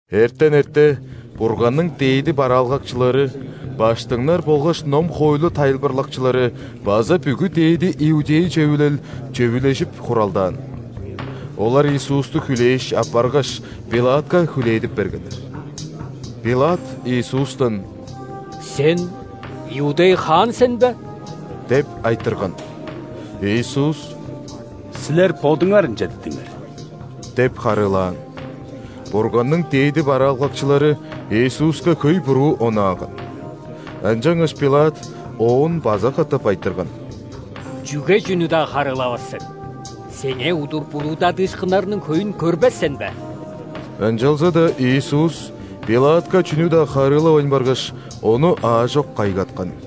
Эртен эрте Бурганның дээди бараалгакчылары, ·баштыңнар болгаш ном-хоойлу тайылбырлакчылары база бүгү ·дээди иудей Чөвүлел чөвүлежип хуралдаан. Олар Иисусту хүлээш, аппаргаш, ·Пилатка хүлээдип бергеннер. Пилат Иисустан: «Сен – иудей хаан сен бе?» – деп айтырган. Иисус: «Силер бодуңар ынча дидиңер» – деп харыылаан. Бурганның дээди бараалгакчылары Иисуска хөй буруу онааган. Ынчангаш Пилат Оон база катап айтырган: «Чүге чүнү-даа харыылавас сен? Сеңээ удур буруудадыышкыннарның хөйүн көрбес сен бе!» Ынчалза-даа Иисус Пилатка чүнү-даа харыылавайн баргаш, ону аажок кайгаткан.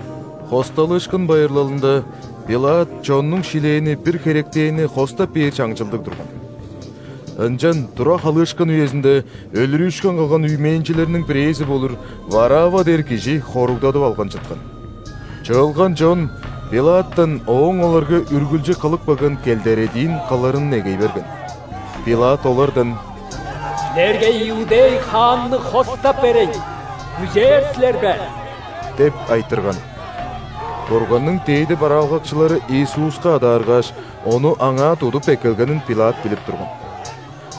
·Хосталыышкын байырлалында ·Пилат чоннуң шилээни бир херектенни хостап бээр чаңчылдыг турган. Ынчан тура халыышкын үезинде өлүрүүшкүн кылган үймээнчилерниң бирээзи болур Варавва дээр кижи хоругдадып алган чыткан. Чыылган чон Пилаттан ооң оларга үргүлчү кылып келген келдередиин кылырын негей берген. Пилат олардан: «Силерге иудей хаанны хостап берейн, күзээр силер бе?» – деп айтырган. (Бурганның дээди бараалгакчылары Иисуска адааргааш, Ону аңаа тудуп эккелгенин Пилат билип турган.)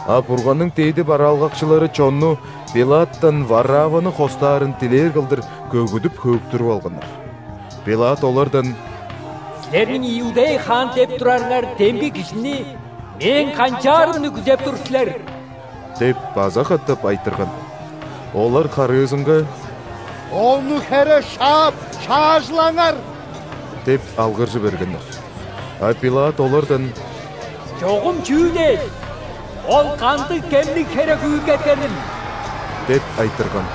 А Бурганның дээди бараалгакчылары чонну Пилаттан Варавваны хостаарын дилээр кылдыр көгүдүп-хөөктүрүп алганнар. Пилат олардан: «Силерниң иудей хаан деп турарыңар демги Кижини мээң канчаарымны күзеп тур силер?» – деп база катап айтырган. Олар харыызынга: «Ону хере шаап шаажылаңар!» – деп алгыржы бергеннер. А Пилат олардан: «Чогум чүү дээш? Ол кандыг кемниг херек үүлгеткенил?» – деп айтырган.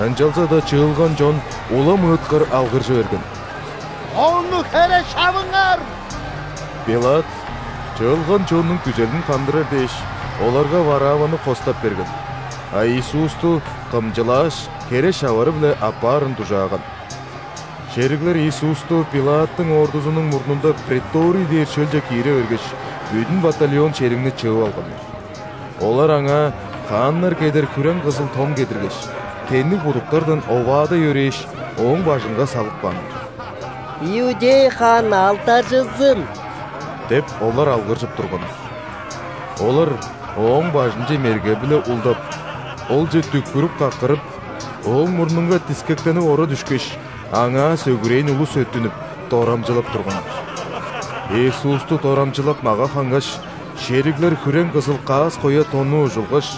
Ынчалза-даа чыылган чон улам ыыткыр алгыржы берген: «Ону хере шавыңар!» Пилат чыылган чоннуң күзелин хандырар дээш, оларга Варавваны хостап берген, а Иисусту кымчылааш, хере шавары-биле аппаарын дужааган. Шериглер Иисусту ·Пилаттың ордузунуң мурнунда преторий дээр шөлче киире бергеш, бүдүн батальон шеригни чыып алганнар. Олар Аңаа хааннар кедер хүрең-кызыл тон кедиргеш, тенниг будуктардан оваадай өрээш, Ооң бажынга салып кааннар. «Иудей хаан алдаржызын!» – деп, олар алгыржып турганнар. Олар Ооң бажынче мерге-биле улдап, Олче дүкпүрүп-каккырып, Ооң мурнунга дискектенип ора дүшкеш, Аңаа сөгүрээн улус өттүнүп, дорамчылап турганнар. Иисусту дорамчылап мага хангаш, шериглер хүрең-кызыл каас-коя тонну ужулгаш,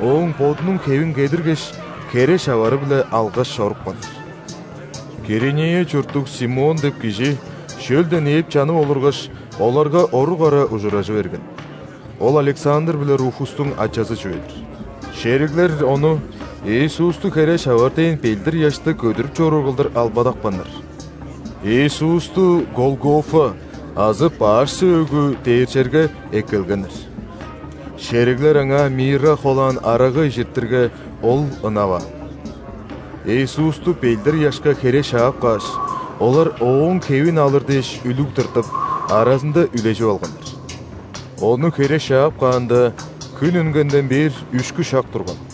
Ооң Бодунуң хевин кедиргеш, хере шавары-биле алгаш чорупканнар. Киринея чурттуг Симон деп кижи шөлден ээп чанып олургаш, оларга орук ара ужуражы берген. (Ол Александр биле Руфустуң ачазы чүве-дир.) Шериглер ону Иисусту хере шавар дээн ·белдир-ыяшты көдүрүп чоруур кылдыр албадапканнар. Иисусту Голгофа азы «Баш сөөгү» дээр черге эккелгеннер. Шериглер Аңаа мирра холаан арага ижиртирге, Ол ынаваан. Иисусту белдир-ыяшка хере шаап кааш, олар Ооң хевин алыр дээш үлүг тыртып, аразында үлежип алганнар. Ону хере шаап каанда, хүн үнгенден бээр үшкү шак турган.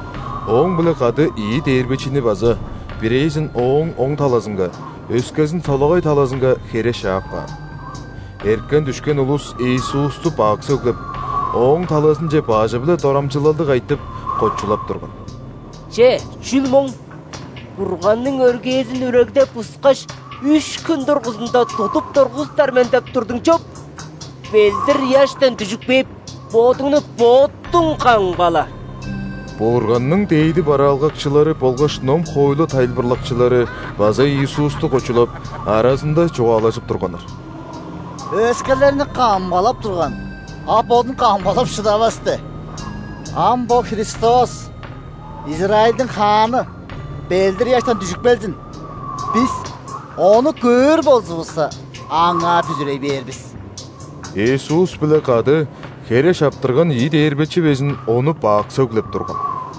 Ооң-биле кады ийи дээрбечини база: бирээзин – Ооң оң талазынга, өскезин – солагай талазынга хере шаап каан. Эрткен-дүшкен улус Иисусту бак сөглеп, Ооң талазынче бажы-биле дорамчылалдыг айтып, кочулап турган: «Че, чүл моң? „Бурганның өргээзин үрегдеп-бускаш, үш хүн дургузунда тудуп тургузуптар мен“ – деп турдуң чоп! Белдир-ыяштан дүжүп кээп, Бодуңну Бодуң камгала!» Бурганның дээди бараалгакчылары болгаш ном-хоойлу тайылбырлакчылары база Иисусту кочулап, аразында чугаалажып турганнар: «Өскелерни камгалап турган, а Бодун камгалап шыдавас де! Ам бо Христос, Израильдиң хааны, белдир-ыяштан дүжүп келзин, бис ону көөр болзувусса, Аңаа бүзүрей бээр бис!» Иисус-биле кады хере шаптырган ийи дээрбечи безин Ону бак сөглеп турган.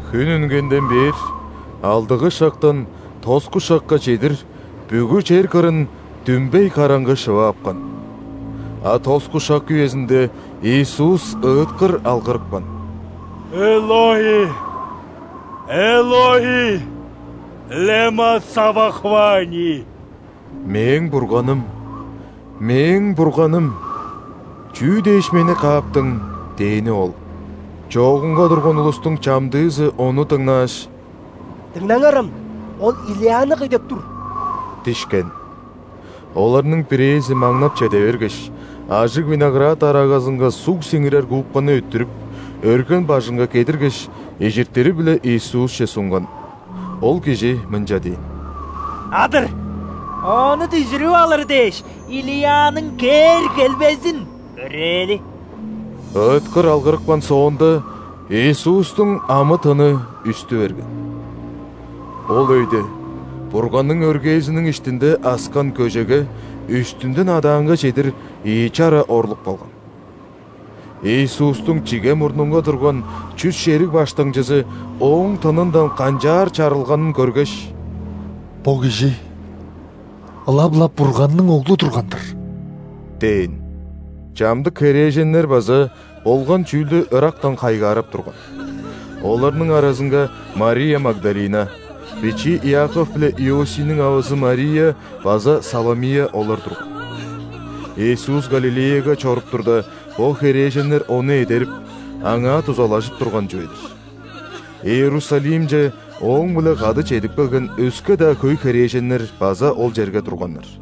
Хүн үнгенден бээр алдыгы шактан тоску шакка чедир бүгү чер кырын дүмбей караңгы шыва апкан. А тоску шак үезинде Иисус ыыткыр алгырыпкан:«Элои, Элои, лема савахфани?!»(«Мээң Бурганым, Мээң Бурганым, чүү дээш Мени кааптың?!» – дээни ол.) Чоогунга турган улустуң чамдыызы ону дыңнааш: «Дыңнаңарам, Ол Илияны кый деп тур» – дишкен. Оларның бирээзи маңнап чеде бергеш, ажыг виноград арагазынга суг сиңирер губканы өттүрүп, өрген бажынга кедиргеш, ижиртири-биле Иисусче сунган. Ол кижи мынча дээн: «Адыр! Ону дүжүрүп алыр дээш, Илияның кээр-келбезин көрээли». Ыыткыр алгырыпкан соонда, Иисустуң амы-тыны үстү берген. Ол өйде Бурганның өргээзиниң иштинде аскан көжеге үстүнден адаанга чедир ийи чара орлуп калган. Иисустуң чиге мурнунга турган чүс шериг баштыңчызы Ооң тынындан канчаар чарылганын көргеш: «Бо кижи ылап-ла Бурганның Оглу турган-дыр!» – дээн. Чамдык херээженнер база болган чүүлдү ырактан хайгаарап турган. Оларның аразынга Мария Магдалина, бичии Иаков биле Иосийниң авазы Мария база Саломия олар турган. Иисус Галилеяга чоруп турда, бо херээженнер Ону эдерип, Аңаа дузалажып турган чүве-дир. Иерусалимче Ооң-биле кады чедип келген өске-даа хөй херээженнер база ол черге турганнар.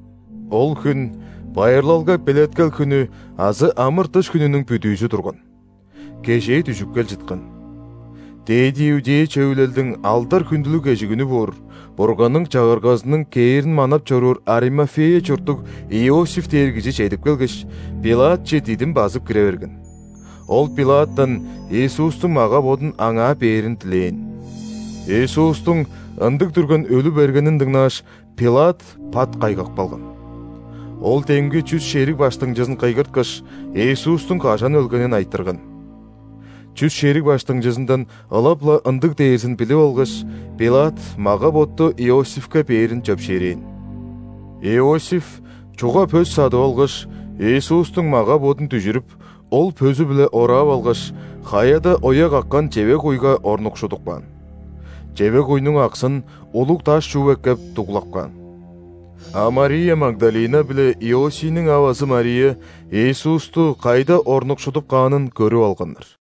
Ол хүн байырлалга белеткел хүнү азы ·амыр-дыш хүнүнүң бүдүүзү турган. Кежээ дүжүп кел чыткан. ·Дээди иудей Чөвүлелдиң алдар-хүндүлүг кежигүнү боор, Бурганның Чагыргазының кээрин манап чоруур Аримафея чурттуг Иосиф дээр кижи чедип келгеш, Пилатче дидим базып кире берген. Ол Пилаттан Иисустуң мага-бодун аңаа бээрин дилээн. Иисустуң ындыг дүрген өлү бергенин дыңнааш, Пилат пат кайгап калган. Ол демги чүс шериг баштыңчызын кыйгырткаш, Иисустуң кажан өлгенин айтырган. Чүс шериг баштыңчызындан ылап-ла ындыг дээрзин билип алгаш, Пилат мага-ботту Иосифке бээрин чөпшээрээн. Иосиф чуга пөс садып алгаш, Иисустуң мага-бодун дүжүрүп, ол пөзү-биле ораап алгаш, хаяда оя каккан чевег-куйга орнукшудуп каан. Чевег-куйнуң аксын, улуг даш чууп эккеп, дуглап каан. А Мария Магдалина биле Иосийниң авазы Мария Иисусту кайда орнукшудуп каанын көрүп алганнар.